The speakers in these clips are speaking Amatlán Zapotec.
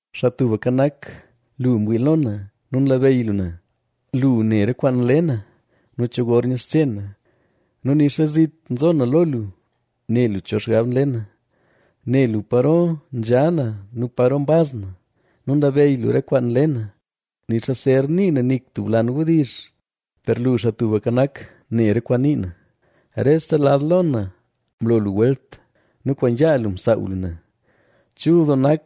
Xaa Tubka Nak, lu mwii lo na nu nlabeyy lu na. Lu ne re kwaan nle na nu cho gor nyixche na nu nixa zit nzo na lo lu, ne lu cho xgab nle na. Ne lu paro nzha na nu paro mbaz na nu nlabeyy lu re kwaan nle na. Nixa zer nii na nik tub lan wdizh, per lu, Xaa Tubka Nak, ne re kwaan nii na. Rese lad lo na mlo lu welt nu kwaan yaa lu msaaw lu na. ¡Chul doo nak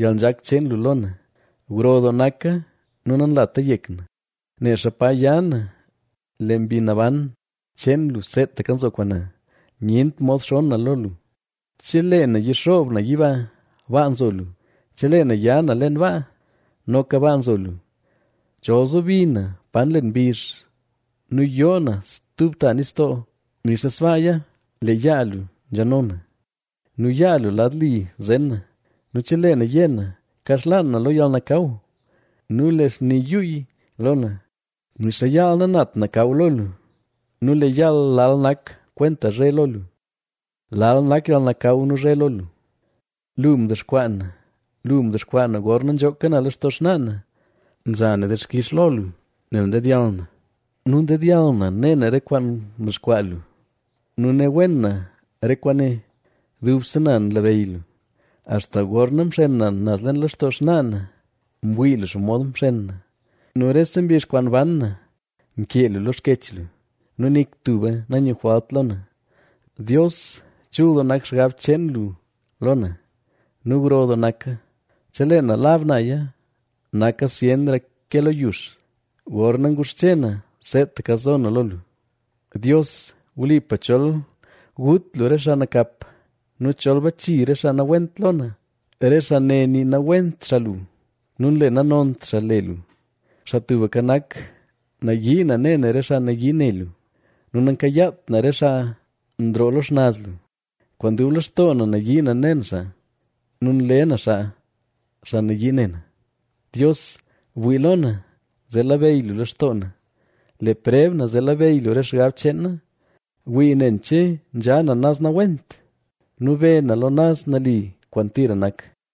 yalnzhak cheen lu lo na; gro doo naka nu nanlata yek na! Nexa pa ya na lee Mbi Naban cheen lu seetaka nzo kwaan na. Nyent mod xonn na lo lu. Chelee na yixoob na yiba, baa nzo lu; chelee na ya na leen baa, noka baa nzo lu. Chol zobi na pa nlen mbizh nu yoo na stub ta nistoo, nixa sbaaya lee yaa lu nzhano na nu yaa lu lad li zen na. Nu chelee na yé na: “Kaxlaan na lo yalnakaw nu lee xni yuuy lo na”; nixa yaal nanat nakaw lo lu nu lee yaal lal nak kwenta zhe lo lu. Lal nak yalnakaw nu zhe lo lu. Lu mdexkwaa na; lu mdexkwaa na gorna nzhooka na lextoo xnaa na. Nza na dixkix lo lu nel ndedyall na nu ndedyall na ne na re kwaan mdexkwaa lu nu ne wen na re kwaane. Dubse na nlabeyy lu, axta gorna mxen na naz leen lextoo xnaa na. Mwii lu xomod mxen na nu rese mbizh kwaan ban na mkee lu lo xkech lu nu nik tuba nanyujwalt lo na. ¡Dios, chul doo nak xgab cheen lu lo na nu gro doo naka! Chelee na lab naya, naka zyenra ke lo yux. Gorna nguxche na, seetaka zo na lo lu. Dios, wlipa chol gut lu re xaa nakap nu chol bachi re xaa nawent lo na. Re xaa ne nii nawent xaa lu nu nle nanont xaa le lu. Xaa Tubka Nak, nayii na ne na re xaa nayii ne lu, nu nankayaat na re xaa nroo lo xnaz lu. Kwaan dub lextoo na nayii na ne na xaa nu nle na xaa, xaa nayii ne na. Dios, bwii lo na, zee labeyy lu lextoo na; le preb na zee labeyy lu re xgab cheen na. Wii nen che nzha na naz nawent nu be na lo naz nali kwaan tira nak.